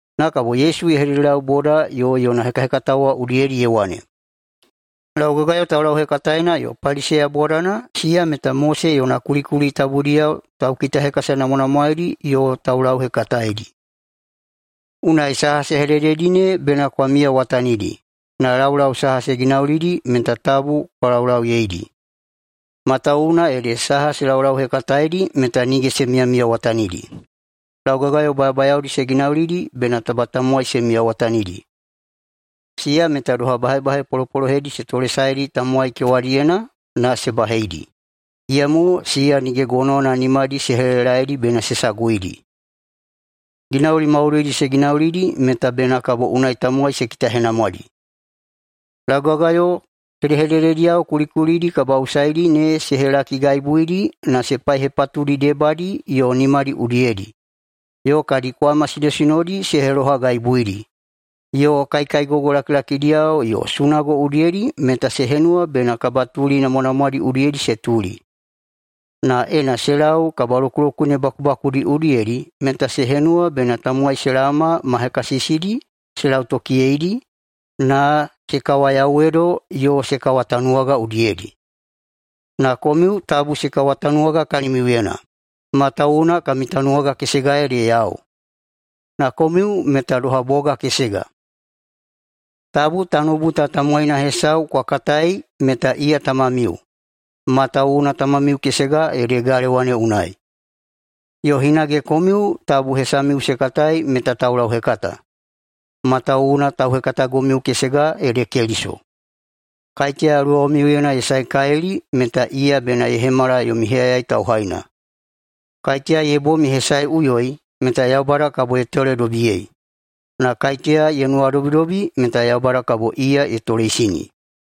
Na kabo Yesu ye hededelau boda yo yona hekahekatao wa udiyedi ye wane, “Laugagayo taulauhekataena yo Paliseya bodana, siya meta Mose yona kulikuli tabudiyao taukitahekasanamwanamwaedi yo taulauhekataedi. Unai saha se hedededi ne bena kwa miyawatanidi, na laulau saha se ginaulidi meta tabu kwa laulauyeidi, matawuwuna ede saha se laulauhekataeidi meta nige se miyamiyawatanidi. Laugagayo bayabayaodi se ginaulidi bena taba tamowai se miyawatanidi, siya meta doha bahebahe polopolohedi se tolesaedi tamowai kewadiyena na se baheidi, iyamo siya nige gonowana nimadi se helelelaedi bena se saguidi. Ginauli maudoidi se ginaulidi meta bena kabo unai tamowai se kitahenamwadi. Laugagayo hedehededediyao kulikulidi kabaꞌusaidi ne se helakigaibuidi na se paihepatudi debadi yo nimadi udiyedi, yo kadi kwama sinosinodi se helohagaibuidi, yo kaikaigogo lakilakidiyao yo sunago udiyedi meta se henuwa bena kabatuli namwanamwadi udiyedi se tuli. Na ena se lau kabalokulokune bakubakudi udiyedi meta se henuwa bena tamowai se laoma ma hekasisidi se lautokiyeidi na se kawayauwedo yo se kawatanuwaga udiyedi. Na komiu tabu se kawatanuwaga kalimiuyena, matawuwuna kami tanuwaga kesega ede yau, na komiu meta doha boga kesega. Tabu tanoubu ta tamowaina hesau kwa katai meta iya tamamiu, matawuwuna tamamiu kesega ede galewa ne unai. Yo hinage komiu tabu hesamiu se katai meta taulauhekata, matawuwuna tauhekatagomiu kesega ede Keliso. Kaiteya luwamiuyena ye saekalili meta iya bena ye hemala yomi heyayai tauhaina. Kaiteya ye bom ye hesaeꞌuyoi meta Yaubada kabo ye toledobiyei, na kaiteya ye nuwadobidobi meta Yaubada kabo iya ye toleisini.”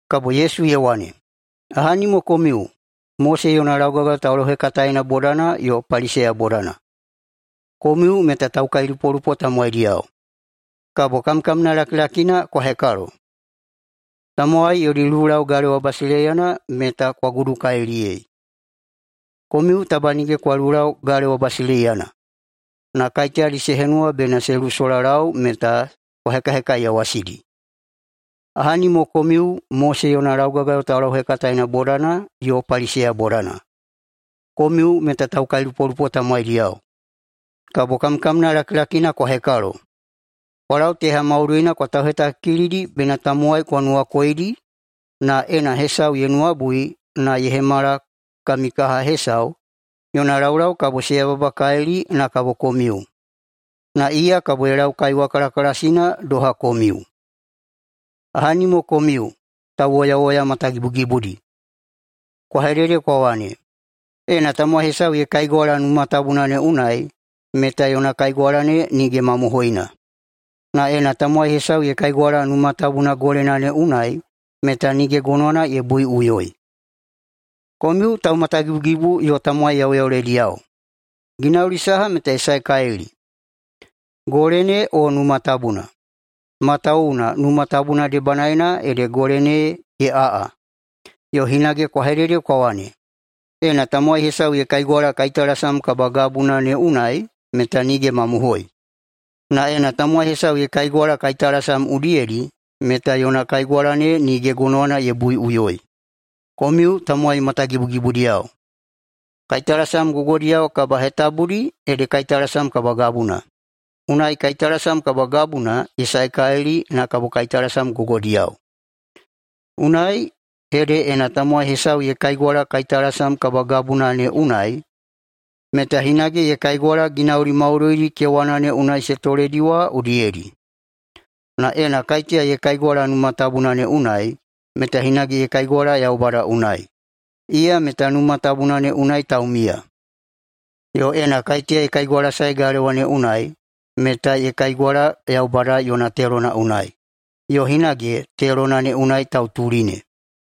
[Kabo Yesu ye wane,] “Ahani mo komiu, Mose yona laugagayo taulauhekataena bodana yo Paliseya bodana, komiu meta taukailupolupo tamowaidiyao! Kabo kamkamna lakilakina kwa hekalo! Tamowai yodi lulau galewa basileiyana meta kwa gudukaliliyei. Komiu taba nige kwa lulau galewa basileiyana, na kaiteyadi se henuwa bena se lusolalau meta kwa hekahekaiyawasidi. Ahani mo komiu, Mose yona laugagayo taulauhekataena bodana yo Paliseya bodana, komiu meta taukailupolupo tamowaidiyao! Kabo kamkamna lakilakina kwa hekalo! Kwa lau teha maudoina kwa tauhetakikilidi bena tamowai kwa nuwakoidi, na ena hesau ye nuwabui na ye hemala kami kaha hesau, yona laulau kabo se yababakalili na kabo komiu, na iya kabo ye lau kaiwa kalakalasina doha komiu. Ahani mo komiu, tauwoyawoya matagibugibudi! Kwa hedede kwa wane, ‘Ena tamowai hesau ye kaigwala Numa Tabuna ne unai meta yona kaigwala ne nige mamohoina, na ena tamowai hesau ye kaigwala Numa Tabuna golena ne unai meta nige gonowana ye buiꞌuyoi.’ Komiu taumatagibugibu yo tamowai yauyaulediyao! Ginauli saha meta ye saekalili, gole ne o Numa Tabuna? Matawuwuna Numa Tabuna debanaena ede gole ne ye aꞌa. Yo hinage kwa hedede kwa wane, ‘Ena tamowai hesau ye kaigwala kaitalasam kabagabuna ne unai meta nige mamohoi, na ena tamowai hesau ye kaigwala kaitalasam udiyedi meta yona kaigwala ne nige gonowana ye buiꞌuyoi.’ Komiu tamowai matagibugibudiyao! Kaitalasam gogodiyao kabahetabudi ede kaitalasam kabagabuna. Unai kaitalasam kabagabuna ye saekalili na kabo kaitalasam gogodiyao. Unai ede ena tamowai hesau ye kaigwala kaitalasam kabagabuna ne unai, meta hinage ye kaigwala ginauli maudoidi kewana ne unai se toledi wa udiyedi. Na ena kaiteya ye kaigwala Numa Tabuna ne unai, meta hinage ye kaigwala Yaubada unai, iya meta Numa Tabuna ne unai taumiya. Yo ena kaiteya ye kaigwalasae galewa ne unai meta ye kaigwala Yaubada yona telona unai, yo hinage telona ne unai tautuli ne.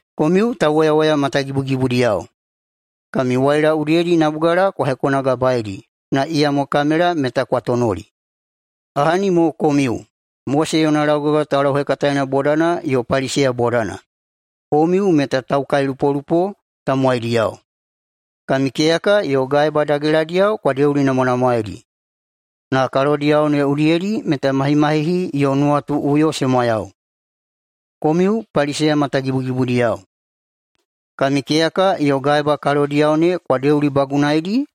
Komiu tauwoyawoya matagibugibudiyao! Kami waila udiyedi nabugala kwa hekonagabaeidi na iyamo kamela meta kwa tonoli. Ahani mo komiu, Mose yona laugagayo taulauhekataena bodana yo Paliseya bodana, komiu meta taukailupolupo tamowaidiyao! Kami keyaka yo gaeba dageladiyao kwa deulinamwanamwaedi, na kalodiyao ne udiyedi meta mahimahihi yo nuwatuꞌuyo se mwayau. Komiu Paliseya matagibugibudiyao! Kami keyaka yo gaeba kalodiyao ne kwa deulibagunaeidi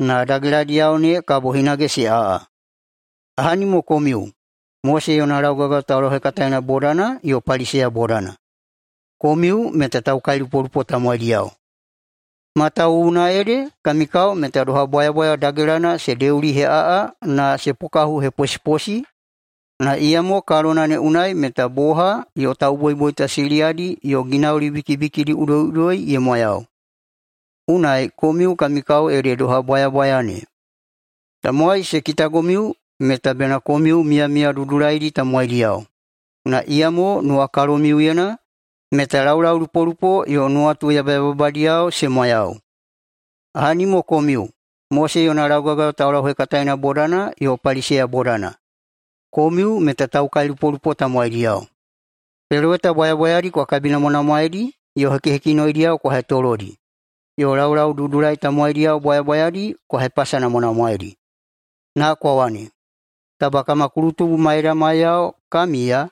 na dageladiyao ne kabo hinage se aꞌa. Ahani mo komiu, Mose yona laugagayo taulauhekataena bodana yo Paliseya bodana, komiu meta taukailupolupo tamowaidiyao! Matawuwuna ede kami kao meta doha bwayabwaya dagelana se deuliheꞌaꞌa na se pokahuheposiposi na iyamo kalona ne unai meta boha yo tauboiboita siliyadi yo ginauli bikibikidi udoiꞌudoi ye mwayau. Unai, komiu kami kao ede doha bwayabwaya ne: Tamowai se kitagomiu meta bena komiu miyamiya dudulaidi tamowaidiyao, na iyamo nuwakalomiuyena meta laulaulupolupo yo nuwatu yabayababadiyao se mwayau. Ahani mo komiu, Mose yona laugagayo taulauhekataena bodana yo Paliseya bodana, komiu meta taukailupolupo tamowaidiyao! Peloweta bwayabwayadi kwa kabinamwanamwaeidi yo hekihekinoidiyao kwa hetolodi, yo laulaududulai tamowaidiyao bwayabwayadi kwa hepasanamwanamwaeidi. Na kwa wane, ‘Taba kama kulutubu maidamaiyao ka miya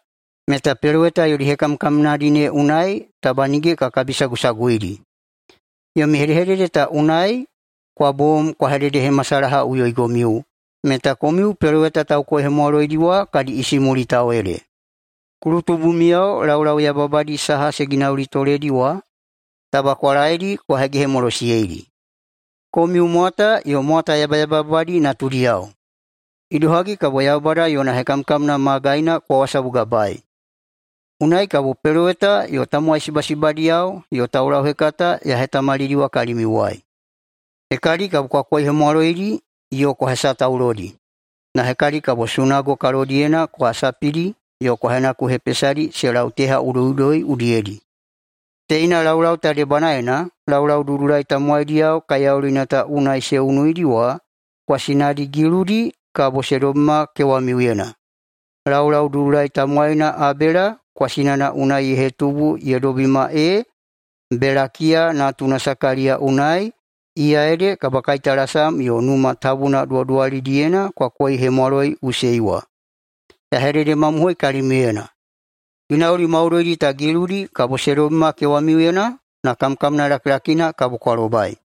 meta peloweta yodi hekamkamnadi ne unai taba nige ka kabisagusaguidi.’ Yomi hedehedede ta unai kwa bom kwa hededehemasalahaꞌuyoigomiu meta komiu peloweta taukoihemwaloidi wa kadi isimulitao ede. Kulutubumiyao laulau yababadi saha se ginaulitoledi wa, taba kwa laedi kwa hegehemolosiyeidi! Komiu mwata yo mwata yabayababadi natudiyao! Idohagi kabo [Yaubada yona] hekamkamna magaina kwa wasabugabaei? Unai kabo peloweta yo tamowai sibasibadiyao yo taulauhekata ya hetamalidiwa kalimiuwai. Hekadi kabo kwa koihemwaloidi yo kwa hesataulodi, na hekadi kabo sunago kalodiyena kwa sapidi yo kwa henakuhepesadi se lau teha udoiꞌudoi udiyedi. Teina laulau ta debanaena laulaududulai tamowaidiyao kaiyaulina ta unai se unuidi wa kwasinadi giludi kabo se dobima kewamiuyena, laulaududulai tamowaina Abela kwasinana unai ye hetubu ye dobima ee Belakiya natuna Sakaliya unai, iya ede kabakaitalasam yo Numa Tabuna duwaduwalidiyena kwa koihemwaloiꞌusei wa. Ya hededemamohoi kalimiuyena: Ginauli maudoidi ta giludi kabo se dobima kewamiuyena na kamkamna lakilakina kabo kwa lobai.”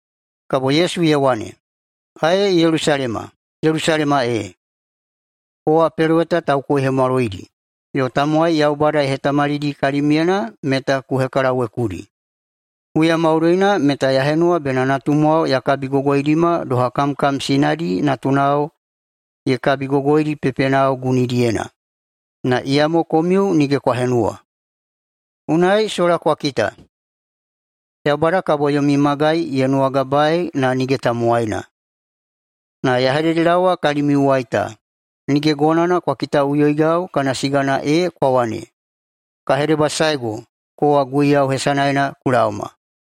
[Kabo Yesu ye wane,] “Ae Yelusalema! Yelusalema ee! Kowa peloweta taukoihemwaloidi yo tamowai Yaubada ye hetamalidi kalimyena meta ku hekalawekudi. Huya maudoina meta ya henuwa bena natumwao ya kabigogoidima doha kamkam sinadi natunao ye kabigogoidi pepenao gunidiyena, na iyamo komiu nige kwa henuwa. Unai sola kwa kita, ‘Yaubada kabo yomi magai ye nuwagabaei na nige tamowaina.’ Na ya hededelaowa kalimiuwai ta, nige gonowana kwa kitaꞌuyoigau kana sigana ee kwa wane, ‘Ka hedebasaego, kowa Guiyau hesanaena ku laoma!’”